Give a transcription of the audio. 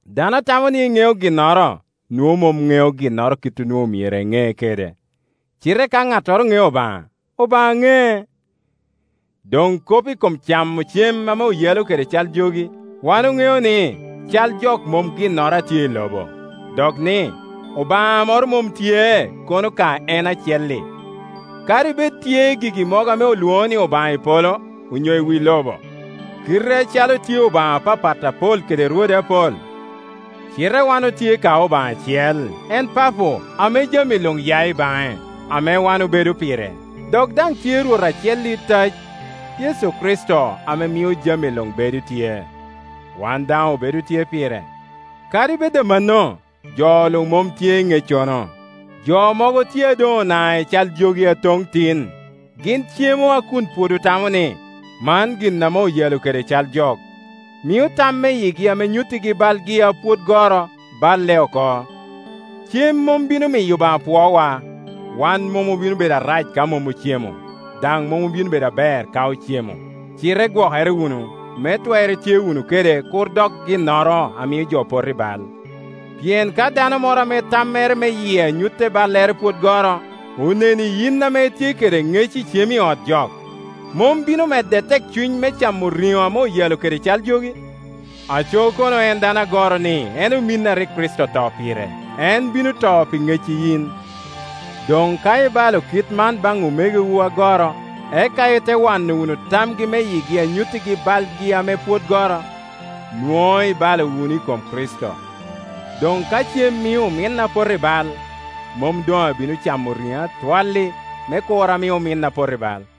Dano a tamo ni eŋeo ginnoro, nwoŋo mom ŋeo ginnoro kit onwoŋo myero eŋe kede. Cite ka ŋattoro ŋeo Obaŋa, Obaŋa ŋec. Doŋ kop i kom camo cem ame oyalo kede cal jogi: wan oŋeo ni “cal jok mom ginnoro a tye i lobo,” dok ni, “Obaŋa moro mom tye kono ka en acel-li.” Kadi bed tye gigi mogo ame olwoŋo ni obaŋa i polo onyo i wi lobo, kite acalo tye obaŋa apapat apol kede rwode apol, cite wan otye ka Obaŋa acel, en Papo, ame jami luŋ ya i baŋe, ame wan obedo pire; dok daŋ tye Rwot acel itac, Yecu Kricito ame mio jami luŋ bedo tye, wan daŋ obedo tye pire. Kadi bed amanno, jo luŋ mom tye i ŋeccono. Jo mogo tye a doŋ ona i cal jogi aton tin; gin cemo a kun pwod otamo ni, “Man gin ame oyalo kede cal jok,” mio tam me yigi ame nyuttigi balgi a pwod goro baile oko. Cem mom bino miyo Obaŋa pwowa; wan mom obino bedo arac ka mom ocemo, daŋ mom obino bedo aber ka ocemo. Cite gwokere wunu, me twer itye wunu kede kur dok ginnoro a mio jo poto i bal. Pien ka dano moro ame tammere me yie a nyutte ballere pwod goro, oneni yin ame itye kede ŋec icem i ot jok, mom bino medde tekcuny me camo riŋo ame oyalo kede cal jogi? Aco kono en dano agoro-ni en ominni a rik Kricito oto pire, en bino to pi ŋecci yin! Doŋ ka ibala kit man baŋ omegowu agoro, eka ite waŋo wunu tamgi me yigi a nyuttigi balgi ame pwod goro, nwoŋo ibalo wunu i kom Kricito. Doŋ ka cem mio ominna poto i bal, mom doŋ abino camo riŋo atwal-li, me kur ami ominna pot i bal.